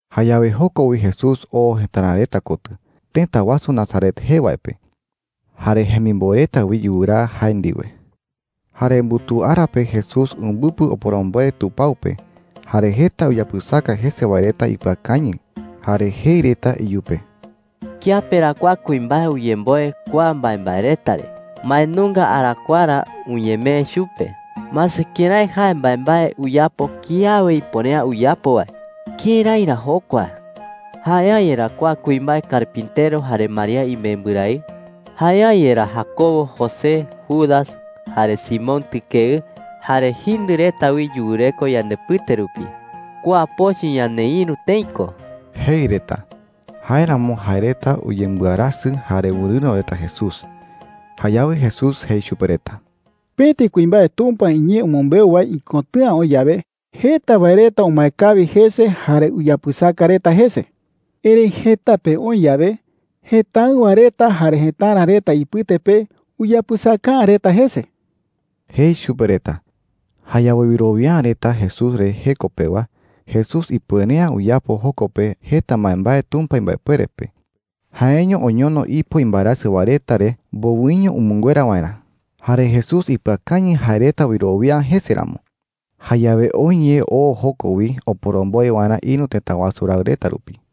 Jayawe joko wi Jesús oo jëtara reta kotɨ, tëta wasu Nazaret jee wae pe. Jare jemimboe reta wi yuraa jae ndiwe. Jare mbutuu ara pe Jesús umbɨpɨ oporomboe tupao pe. Jare jeta uyapɨsaka jese wae reta ipɨakañɨ jare jei reta iyupe: “¿Kiape ra kua kuimbae uyemboe kua mbaembae reta re? ¿Mbae nunga arakuaa ra uñemee chupe? Mase kërái jae mbaembae uyapo kiawe ipuere’ä uyapo wae. ¿Kërái ra jokua?” jei reta. “¿Jae’ä yerá kua kuimbae carpintero jare María imembɨrae? ¿Jae’ä yerá Jacobo, José, Judas, jare Simón tɨkeɨ? Jare jindɨ reta wi yureko yandepɨte rupi. Kua pochɨ ñaneïru tëi ko,” jei reta. Jáeramo jae reta uyembɨarasɨ jare wɨrɨ̈ro reta Jesús. Jayawe Jesús jei chupe reta: “Pëti kuimbae Tumpa iñee umɨmbeu wae ikotɨ̈a oï yawe, jeta wae reta umae kawi jese jare uyapɨsaka reta jese,” jei. “Erëi jëta pe oï yawe jëtáɨwa reta jare jëtara reta ipɨte pe, uyapɨsaka’ä reta jese,” jei chupe reta. Jayawe wɨrowia’ä reta Jesús re jeko pewa, Jesús ipuere’ä uyapo joko pe jeta mbaembae Tumpa imbaepuere pe. Jaeño oñono ipo imbaerasɨ wae reta re mbowɨño umɨnguera waerä. Jare Jesús ipɨakañɨ jae reta wɨrowia’ä jese ramo. Jayawe oë ye oo joko wi oporomboe waerä ïru tëta wasu raɨ reta rupi.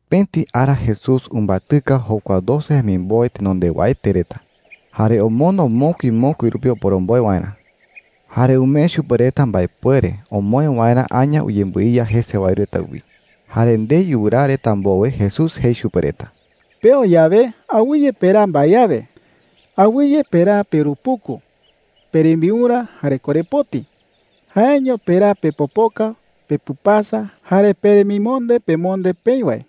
Pëti ara Jesús umbatɨka jokua doce jemimboe tenondewaete reta, jare omondo mokui mokui rupi oporomboe waerä. Jare umee chupe reta mbaepuere omoë waerä aña uyembɨiya jese wae reta wi. Jare ndei yuraa reta mbowe, Jesús jei chupe reta: “Peo yawe, awɨye peraa mbae awe. Awɨye peraa peurupuku, perembiurä, jare korepoti. Jaeño peraa pepopoka, pepɨpasa, jare peremimonde pemonde peï wae,”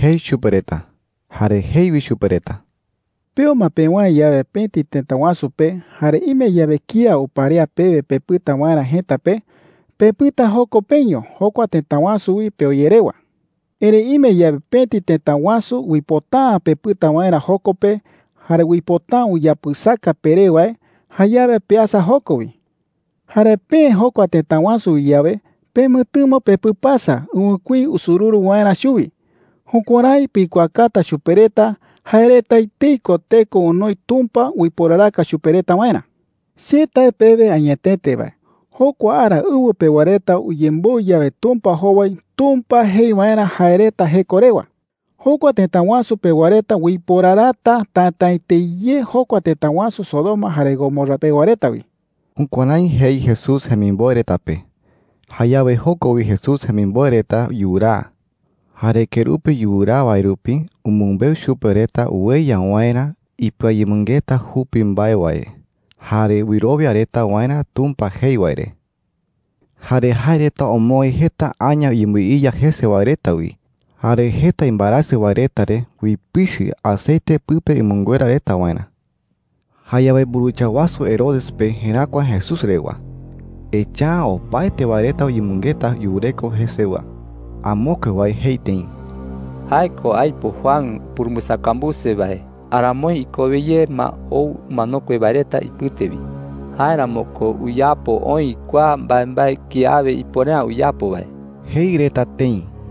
jei chupe reta. Jare jei wi chupe reta: “Peo ma pewäe yawe pëti tëta wasu pe, jare ime yawe kía uparea pewe pepɨta waerä jëta pe, pepɨta joko peño jokua tëta wasu wi peo ye rewa,” jei. “Erëi ime yawe pëti tëta wasu uipota’ä pepɨta waerä joko pe jare uipota’ä uyapɨsaka peré wae, jayawe peasa joko wi,” jei. “Jare peë jokua tëta wasu wi yawe, pemɨtɨmo pepɨpasa ɨwɨkuí usururu waerä chuwi. Jukuärái pikuaakata chupe reta jae reta etei ko teko onoi Tumpa uiporaraka chupe reta waerä,” jei. “Che tae pewe añetete wae, jokua ara ɨwɨ pewa reta uyemboɨ yawe Tumpa jowai Tumpa jei waerä jae reta jeko rewa, jokua tëta wasu pewa reta uiporarata tätaete ye jokua tëta wasu Sodoma jare Gomorra pewa reta wi.” Jukuärái jei Jesús jemimboe reta pe. Jayawe joko wi Jesús jemimboe reta yuraa. Jare kerupi yuraa wae rupi umɨmbeu chupe reta ueya waerä ipɨayemɨngeta jupi mbae wae jare wɨrowia reta waerä Tumpa jei wae re. Jare jae reta omoë jeta aña uyembɨiya jese wae reta wi. Jare jeta imbaerasɨ wae reta re uipichɨ aceite pɨpe umɨnguera reta waerä. Jayawe mburuwicha wasu Herodes pe jeräkua Jesús rewa, echa’ä opaete wae reta uyemɨngeta yureko jesewa. Amokue wae jei tëi: “Jae ko aipo Juan upurumbɨsakambuse wae aramoi ikowe ye ma ou umanokue wae reta ipɨte wi. Jáeramo ko uyapo oï kua mbaembae kiawe ipuere’ä uyapo wae,” jei reta tëi.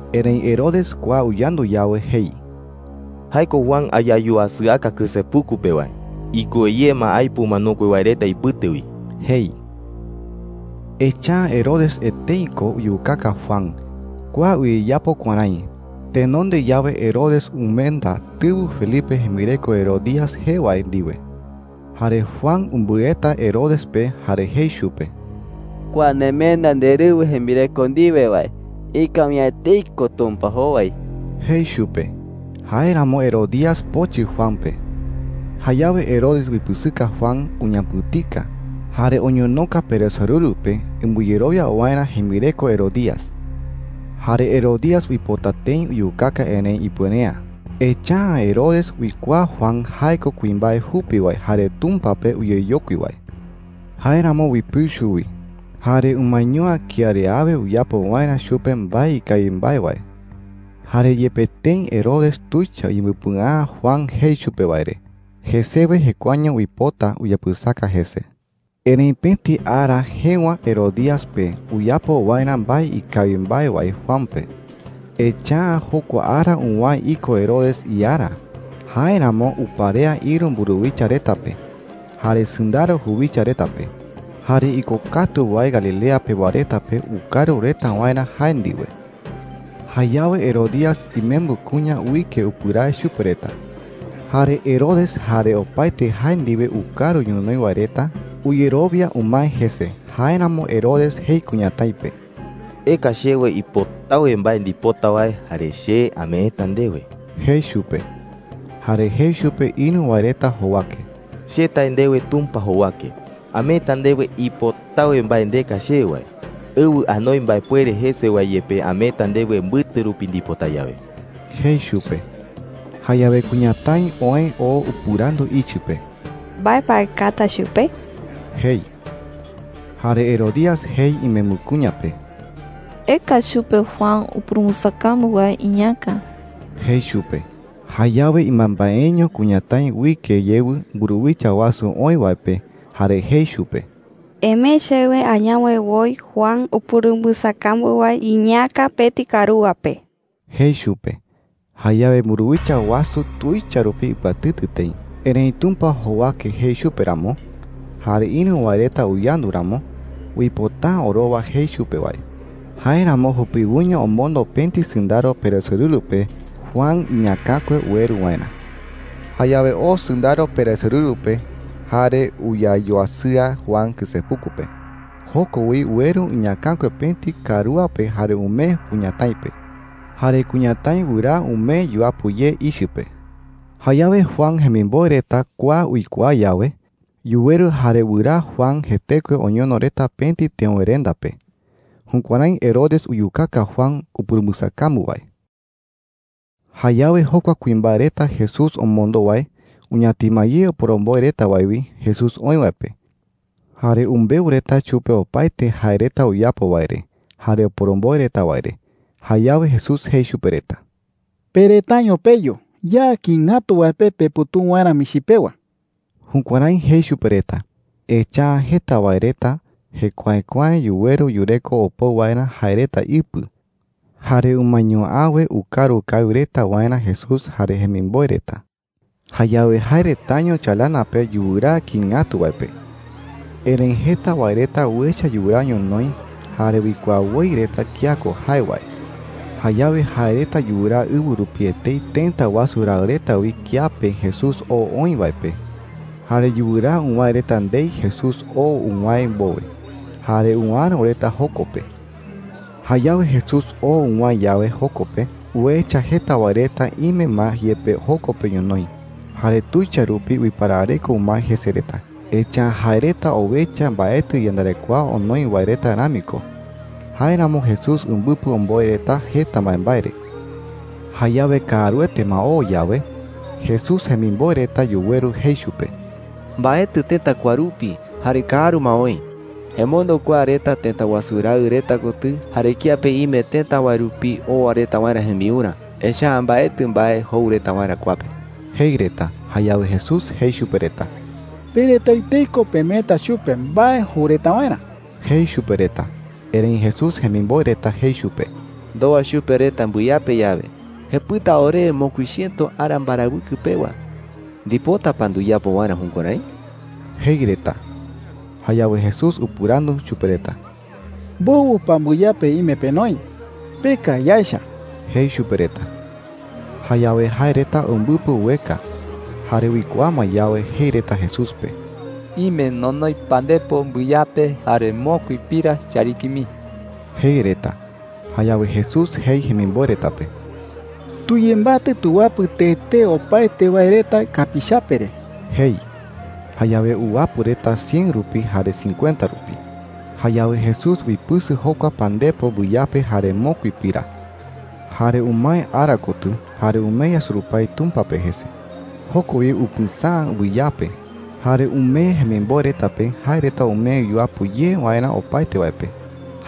Erëi Herodes kua uyandu yawe, jei: “Jae ko Juan ayayuasɨaka kɨsepuku pe wae. Ikowe ye ma aipo umanokue wae reta ipɨte wi,” jei. Echa’ä Herodes etei ko uyukaka Juan. Kua uyeyapo kuärái: Tenonde yawe Herodes umenda tɨwɨ Felipe jembireko Herodías jee wae ndiwe. Jare Juan umbɨeta Herodes pe jare jei chupe: “Kua nemenda nderɨwɨ jembireko ndiwe wae, ikawi’ä etei ko Tumpa jowai,” jei chupe. Jáeramo Herodías pochɨ Juan pe. Jayawe Herodes uipɨsɨka Juan, uñapɨ̈tika, jare oñonoka peresorɨru pe umbɨyerowia waerä jembireko Herodías. Jare Herodías uipota tëi uyukaka, erëi ipuere’ä. Echa’ä Herodes uikuaa Juan jae ko kuimbae jupi wae jare Tumpa pe uyeyokui wae. Jáeramo uipɨu chuwi, jare umaeño’ä kía re awe uyapo waerä chupe mbae ikawi mbae wae. Jare yepe tëi Herodes tuicha uyembɨpɨa’ä Juan jei chupe wae re, jesewe jekuaeño uipota uyapɨsaka jese. Erëi pëti ara jëwa Herodías pe uyapo waerä mbae ikawi mbae wae Juan pe. Echa’ä jokua ara uwäe iko Herodes iara. Jáeramo uparea ïru mburuwicha reta pe, jare sɨndaro juwicha reta pe, jare ikokatu wae Galilea pewa reta pe ukaru reta waerä jae ndiwe. Jayawe Herodías imembɨ kuña uike upɨrae chupe reta. Jare Herodes jare opaete jae ndiwe ukaru ñonoï wae reta uyerowia umae jese. Jáeramo Herodes jei kuñatái pe: “Eka chewe ipotawe mbae ndipota wae, jare che ameeta ndewe,” jei chupe. Jare jei chupe ïru wae reta jowake: “Che tae ndewe Tumpa jowake, ameeta ndewe ipotawe mbae ndeka chewe wae. Ɨwɨ anoi mbaepuere jese wae yepe ameeta ndewe mbɨte rupi ndipota yawe,” jei chupe. Jayawe kuñatái oë oo upɨrandu ichɨ pe: “¿Mbae pa aekata chupe?” jei. Jare Herodías jei imembɨ kuña pe: “Eka chupe Juan upurumbɨsakambu wae iñäka,” jei chupe. Jayawe ɨmambaeño kuñatái uike yewɨ mburuwicha wasu oï wae pe jare jei chupe: “Emee chewe añawe woi Juan upurumbɨsakambu wae iñäka pëti karúa pe,” jei chupe. Jayawe mburuwicha wasu tuicha rupi ipɨatɨtɨ tëi. Erëi Tumpa jowake jei chupe ramo, jare ïru wae reta uyandu ramo, uipota’ä orowa jei chupe wae. Jáeramo jupiwoiño omondo pëti sɨndaro peresorɨru pe Juan iñäkakue ueru waerä. Jayawe oo sɨndaro peresorɨru pe jare uyayuasɨa Juan kɨsepuku pe. Joko wi ueru iñäkakue pëti karúa pe jare umee kuñatái pe. Jare kuñatái wɨraa umee yuapɨ ye ichɨ pe. Jayawe Juan jemimboe reta kua uikuaa yawe, yuweru jare wɨraa Juan jetekue oñono reta pëti teöwerenda pe. Jukuärái Herodes uyukaka Juan upurumbɨsakambu wae. Jayawe jokua kuimbae reta Jesús omondo wae uñatima ye oporomboe reta wae wi Jesús oï wae pe. Jare umbeu reta chupe opaete jae reta uyapo wae re jare oporomboe reta wae re. Jayawe Jesús jei chupe reta: “Pe retaño peyu ya kïi ngatu wae pe peputuu waerä michi pewa.” Jukuärái jei chupe reta, echa’ä jeta wae reta jekuaekuae yuweru yureko opou waerä jae reta ipɨ. Jare umaeño’äwe ukaru kawi reta waerä Jesús jare jemimboe reta. Jayawe jae retaño chalana pe yuraa kïi ngatu wae pe. Erëi jeta wae reta uecha yuraa ñonoï jare uikuaa woi reta kía ko jae wae. Jayawe jae reta yuraa ɨwɨ rupi etei tëta wasu raɨ reta wi kiape Jesús oo oï wae pe. Jare yuraa uwäe reta ndei Jesús oo uwäe mbowe, jare uäro reta joko pe. Jayawe Jesús oo uwäe yawe joko pe, uecha jeta wae reta ime ma yepe joko pe ñonoï. Jare tuicha rupi uiparareko umae jese reta, echa’ä jae reta owecha mbaetɨ iyandarekoa onoi wae reta rami ko. Jáeramo Jesús umbɨpɨ omboe reta jeta mbaembae re. Jayawe kaaruete ma oo yawe, Jesús jemimboe reta yuweru jei chupe: “Mbaetɨ tëta kua rupi jare kaaru ma oï,” jei reta. “Emondo kua reta tëta wasu raɨ reta kotɨ jare kiape ime tëta wae rupi owa reta waerä jembiurä. Echa’ä mbaetɨ mbae jou reta waerä kua pe,” jei reta. Jayawe Jesús jei chupe reta: “Pe reta etei ko pemeeta chupe mbae jou reta waerä,” jei chupe reta. Erëi Jesús jemimboe reta jei chupe: “¡Ndowa chupe reta mbɨyape yawe, jepɨta orewe mokui chiëto ara mbarawɨkɨ pewa! ¿Ndipota pa nduyapo waerä jukuärái?” jei reta. Jayawe Jesús upɨrandu chupe reta: “¿Mbowɨ pa mbɨyape ime penoi? Peka yaecha,” jei chupe reta. Jayawe jae reta umbɨpɨ ueka, jare uikuaa ma yawe, jei reta Jesús pe: “Ime nonoi pandepo mbɨyape jare mokui pira chariki mii,” jei reta. Jayawe Jesús jei jemimboe reta pe: “Tuyembatɨ tuwapɨ tee tee opaete wae reta kapiichape re,” jei. Jayawe uwapɨ reta cien rupi jare cincuenta rupi. Jayawe Jesús uipɨsɨ jokua pandepo mbɨyape jare mokui pira. Jare umae ara kotɨ jare umee yasurupái Tumpa pe jese. Joko wi upɨsäa mbɨyape, jare umee jemimboe reta pe jae reta umee yuapɨ ye waerä opaete wae pe.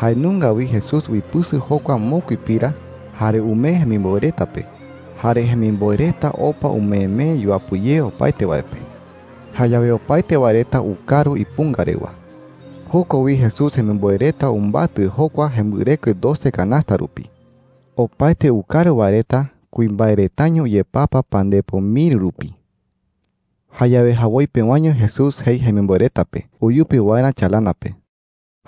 Jae nunga wi Jesús uipɨsɨ jokua mokui pira, jare umee jemimboe reta pe. Jare jemimboe reta opa umeemee yuapɨ ye opaete wae pe. Jayawe opaete wae reta ukaru ipunga rewa. Joko wi Jesús jemimboe reta umbatɨ jokua jembɨrekue doce kanasta rupi. Opaete ukaru wae reta kuimbae retaño uyepapa pandepo miri rupi. Jayawe jawoi pewaño Jesús jei jemimboe reta pe uyupi waerä chalana pe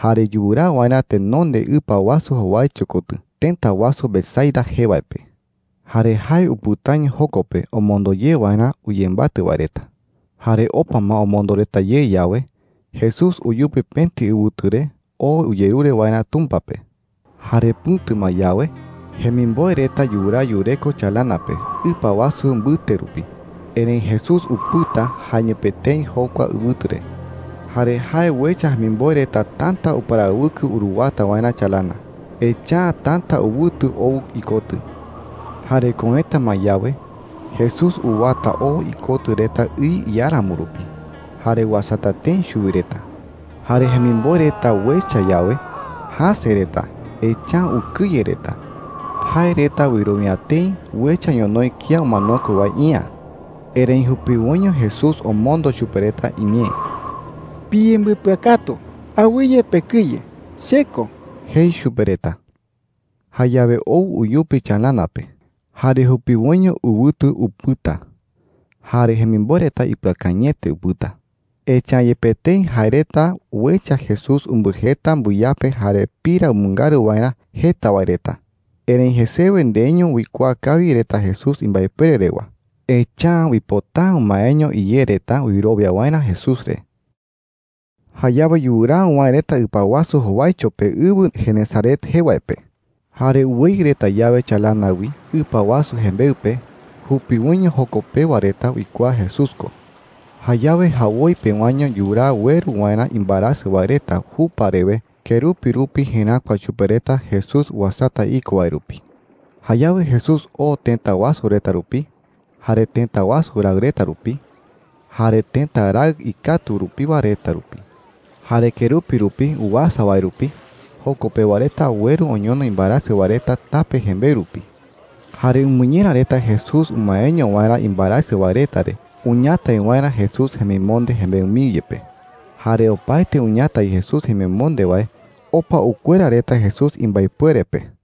jare yuraa waerä tenonde ɨpa wasu jowaicho kotɨ tëta wasu Betsaida jee wae pe. Jare jae upɨtaño joko pe omondo ye waerä uyembatɨ wae reta. Jare opa ma omondo reta ye yawe, Jesús uyupi pëti ɨwɨtu re oo uyerure waerä Tumpa pe. Jare pɨ̈tu ma yawe, jemimboe reta yuraa yureko chalana pe ɨpa wasu mbɨte rupi, erëi Jesús upɨta jaeño pe etei jokua ɨwɨtu re. Jare jae uecha jemimboe reta täta uparawɨkɨ uruwata waerä chalana. Echa’ä täta ɨwɨtu ou ikotɨ. Jare köeta ma yawe, Jesús uwata oo ikotɨ reta ɨ iáramo rupi jare uasata tëi chuwi reta. Jare jemimboe reta uecha yawe, jäse reta. Echa’ä ukɨye reta. Jae reta wɨrowia tëi uecha ñonoï kía umanokue wae iä. Erëi jupiwoiño Jesús omondo chupe reta iñee: “Piyembɨpɨakatu. Awɨye pekɨye. Che ko,” jei chupe reta. Jayawe ou uyupi chalana pe, jare jupiwoiño ɨwɨtu upɨta. Jare jemimboe reta ipɨakañɨete upɨta. Echa’ä yepe tëi jae reta uecha Jesús umbɨjeta mbɨyape jare pira umɨngaru waerä jeta wae reta, erëi jesewe ndeiño uikuaa kawi reta Jesús imbaepuere rewa. Echa’ä uipota’ä umaeño iyé reta wɨrowia waerä Jesús re. Jayawe yuraa uwäe reta ɨpa wasu jowaicho pe ɨwɨ Genesaret jee wae pe. Jare uweyɨ reta yawe chalana wi ɨpa wasu jembeɨ pe, jupiwoiño joko pewa reta uikuaa Jesús ko. Jayawe jawoi pewaño yuraa ueru waerä imbaerasɨ wae reta jupa rewe kerupi rupi jeräkua chupe reta Jesús uasata iko wae rupi. Jayawe Jesús oo tëta wasu reta rupi, jare tëta wasu raɨ reta rupi, jare tëta raɨ ikatu rupiwa reta rupi. Jare kerupi rupi uasa wae rupi, joko pewa reta ueru oñono imbaerasɨ wae reta tape jembeɨ rupi. Jare umɨñera reta Jesús umaeño waerä imbaerasɨ wae reta re uñatai waerä Jesús jemimonde jembeɨ mii yepe. Jare opaete uñatai Jesús jemimonde wae, opa ukuera reta Jesús imbaepuere pe.